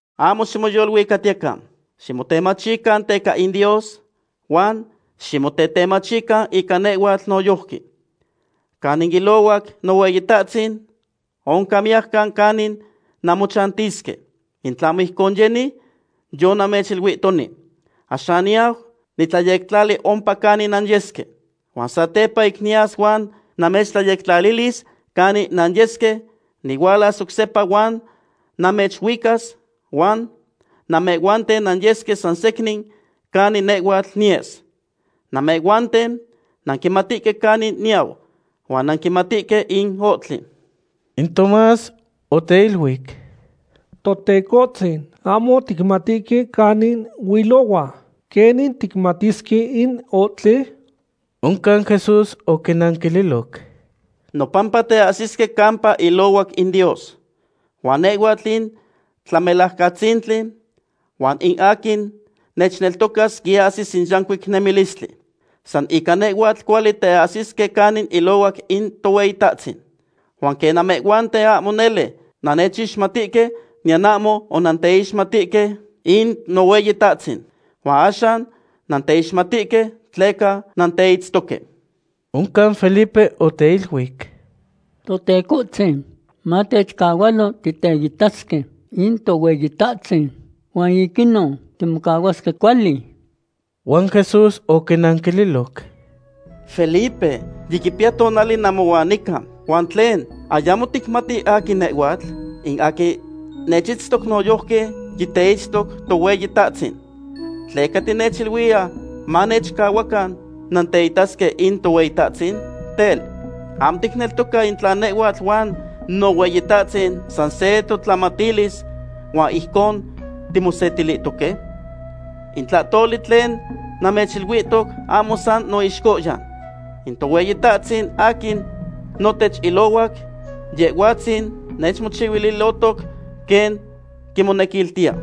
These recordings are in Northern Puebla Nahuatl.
’Ahmo ximoyoluicatiyecan. Ximotetemachican teca in Dios huan ximotetemachican ica nehhuatl noyojqui. Canin ilohuac Nohueyitahtzin oncan miyajcan canin nanmochantisque. In tlahmo ijcon yeni, yonamechiluihtoni. Axan niyau nitlayectlali ompa canin nanyesque. Huan satepa ic niyas huan namechtlayectlalilis canin nanyesque, nihualas oc sepa huan namechuicas, huan namehhuanten nanyesque sansecnin canin nehhuatl niyes. Namehhuanten nanquimatihque canin niyau, huan nanquimatihque in ohtli. In Tomás oteiluic: ―Totecohtzin, ahmo ticmatihque canin huilohua; ¿quenin ticmatisque in ohtli? Oncan Jesús oquinanquililoc: ―Nopampa teahsisque campa ilohuac in Dios. Huan nehhuatl in Tlamelajcatzintli, huan in aquin nechneltocas quiahsis in yancuic nemilistli. San ica nehhuatl cuali teahsisque canin ilohuac in Tohueyitahtzin. Huan quen namehhuanten ahmo nele nannechixmatihque, niyan ahmo onanteixmatihque in Nohueyitahtzin. Huan axan nanteixmatihque, tleca nanteitztoque. Oncan Felipe oteiluic: ―Totecohtzin, matechcahualo titeitasque in Tohueyitahtzin huan ic inon timocahuasque cuali. Huan Jesús oquinanquililoc: ―Felipe, yiquipiya tonali namohuan nica, ¿huan tlen, ayamo ticmati aquin nehhuatl? In aquin nechitztoc noyojqui yiteitztoc Tohueyitahtzin. ¿Tleca tinechiluiya manamechcahua nanteitasque in Tohueyitahtzin? Tel, ¿ahmo ticneltoca in tla nehhuatl huan Nohueyitahtzin san se totlamatilis huan ijcon timosetilihtoque? In tlahtoli tlen namechiluihtoc ahmo san noixcohyan. In Tohueyitahtzin aquin notech ilohuac, Yehhuatzin nechmochihuilihtoc quen quimonequiltiya.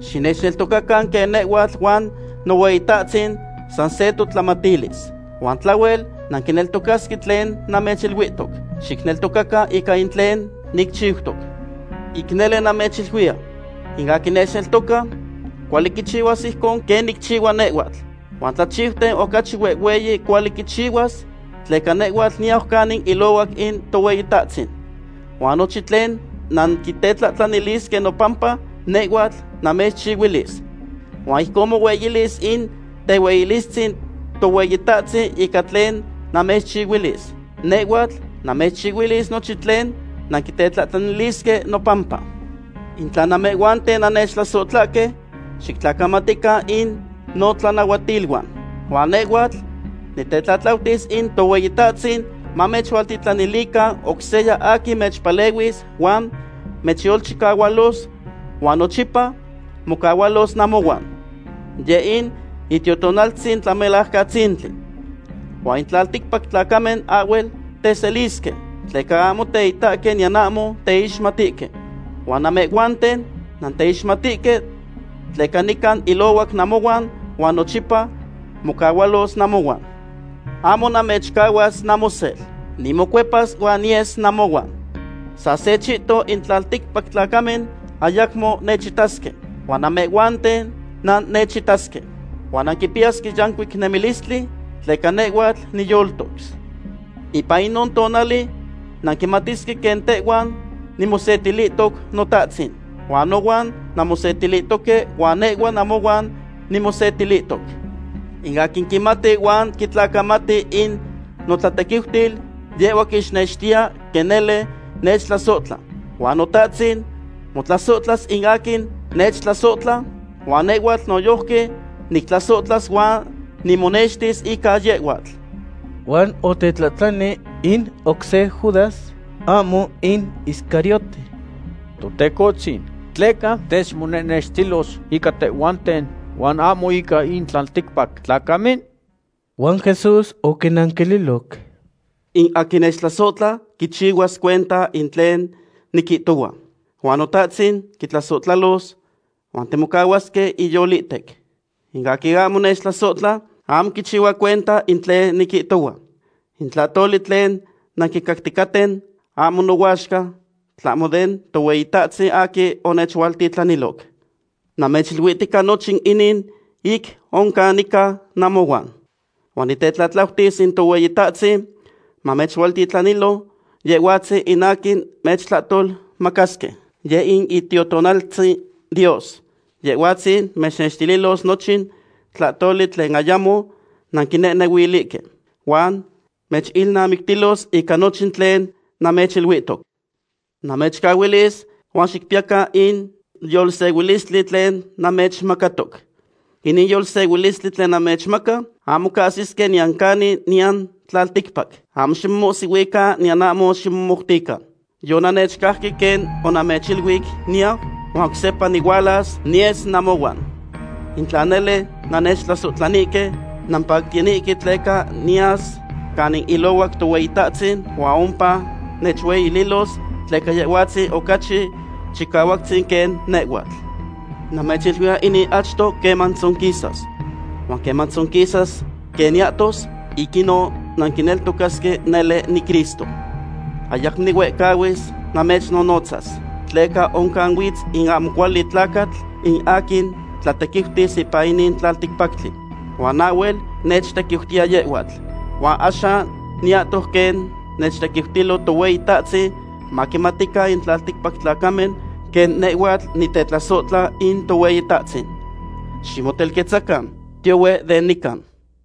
Xinechneltocacan quen nehhuatl huan Nohueyitahtzin san se totlamatilis. Huan tlahhuel nanquineltocasque tlen namechiluihtoc, xicneltocacan ica in tlen nicchiutoc. Ic nele namechiluiya, in aquin nechneltoca, cuali quichihuas ijcon quen nicchihua nehhuatl. Huan tlachiuten ocachi huehhueyi cuali quichihuas, tleca nehhuatl niyau canin ilohuac in Tohueyitahtzin. Huan nochin tlen nanquitetlahtlanilisque nopampa, nehhuatl namechchihuilis. Huan ijcon monextilis in tehueyilistzin Tohueyitahtzin ica tlen namechchihuilis. Nehhuatl namechchihuilis nochin tlen nanquitetlahtlanilisque nopampa. ’In tla namehhuanten nannechtlasotlahque, xictlacamatican in notlanahuatiluan. Huan nehhuatl nitetlatlautis in Tohueyitahtzin mamechualtitlanilican oc seya aquin mechpalehuilos huan mechyolchicahualos, huan nochipa mocahualos namohuan. Yeh in Itiotonaltzin Tlamelajcatzintli. Huan in tlalticpac tlacamen ahhuel teselisque, tleca ahmo teitahque niyan ahmo teixmatihque. Huan namehhuanten nanteixmatihque, tleca nican ilohuac namohuan huan nochipa mocahualos namohuan. Ahmo namechcahuas namosel. Nimocuepas huan niyes namohuan. Sa se chihton in tlalticpac tlacamen ayacmo nechitasque, huan namehhuanten nannechitasque. Huan nanquipiyasque yancuic nemilistli, tleca nehhuatl niyoltos. Ipan inon tonali nanquimatisque quen tehuan nimosetilihtoc Notahtzin. Huan nohuan nanmosetilihtoque huan nehhua namohuan nimosetilihtoc. In aquin quimati huan quitlacamati in notlatequiutil, yehhua quixnextiya quen nele nechtlasohtla. Huan Notahtzin motlasohtlas in aquin nechtlasohtla, huan nehhuatl noyojqui nictlasohtlas huan nimonextis ica yehhuatl. Huan otetlahtlani in oc se Judas, ahmo in Iscariote: ―Totecohtzin, ¿tleca techmonehnextilos ica tehhuanten, huan ahmo ica in tlalticpac tlacamen? Huan Jesús oquinanquililoc: ―In aquin nechtlasohtla quichihuas cuenta in tlen niquihtohua. Huan Notahtzin quitlasohtlalos, huan timocahuasque iyolihtec. In aquin ahmo nechtlasohtla, ahmo quichihua cuenta in tlen niquihtohua. In tlahtoli tlen nanquicacticaten ahmo nohuaxca, tlahmo den Tohueyitahtzin aquin onechualtitlaniloc. ’Namechiluihtica nochin inin ic oc oncan nica namohuan. Huan nitetlatlautis in Tohueyitahtzin mamechualtitlanilo Yehhuatzin in aquin mechtlahtolmacasque, yeh in Itiotonaltzin Dios. Yehhuatzin mechnextililos nochin tlahtoli tlen ayamo nanquinehnehuilihque, huan mechilnamictilos ica nochin tlen namechiluihtoc. ’Namechcahuilis huan xicpiyacan in yolsehuilistli tlen namechmacatoc. Inin yolsehuilistli tlen namechmaca, ahmo cahsisque niyan canin nican tlalticpac. Ahmo ximomohsihuican niyan ahmo ximomoutican. Yonannechcajque quen onamechiluic niyau, huan oc sepa nihualas niyes namohuan. In tla nele nannechtlasohtlanihque, nampactiyanihque tleca niyas canin ilohuac Tohueyitahtzin huan ompa nechueyililos, tleca Yehhuatzin ocachi Chicahuactzin quen nehhuatl. Namechiluiya inin achto queman tzonquisas. Huan queman tzonquisas quen niyahtos, ic inon nanquineltocasque nele niCristo. ’Ayacmo nihuehcahuis namechnonotzas, tleca oncan huitz in ahmo cuali tlacatl, in aquin tlatequiutis ipan inin tlalticpactli. Huan ahhuel nechtequiutiya yehhuatl. Huan axan niyahtos quen nechtequiutilo Tohueyitahtzin, maquimatican in tlalticpac tlacamen quen nehhuatl nitetlasohtla in Tohueyitahtzin. Ximotelquetzacan. Tiyohue den nican.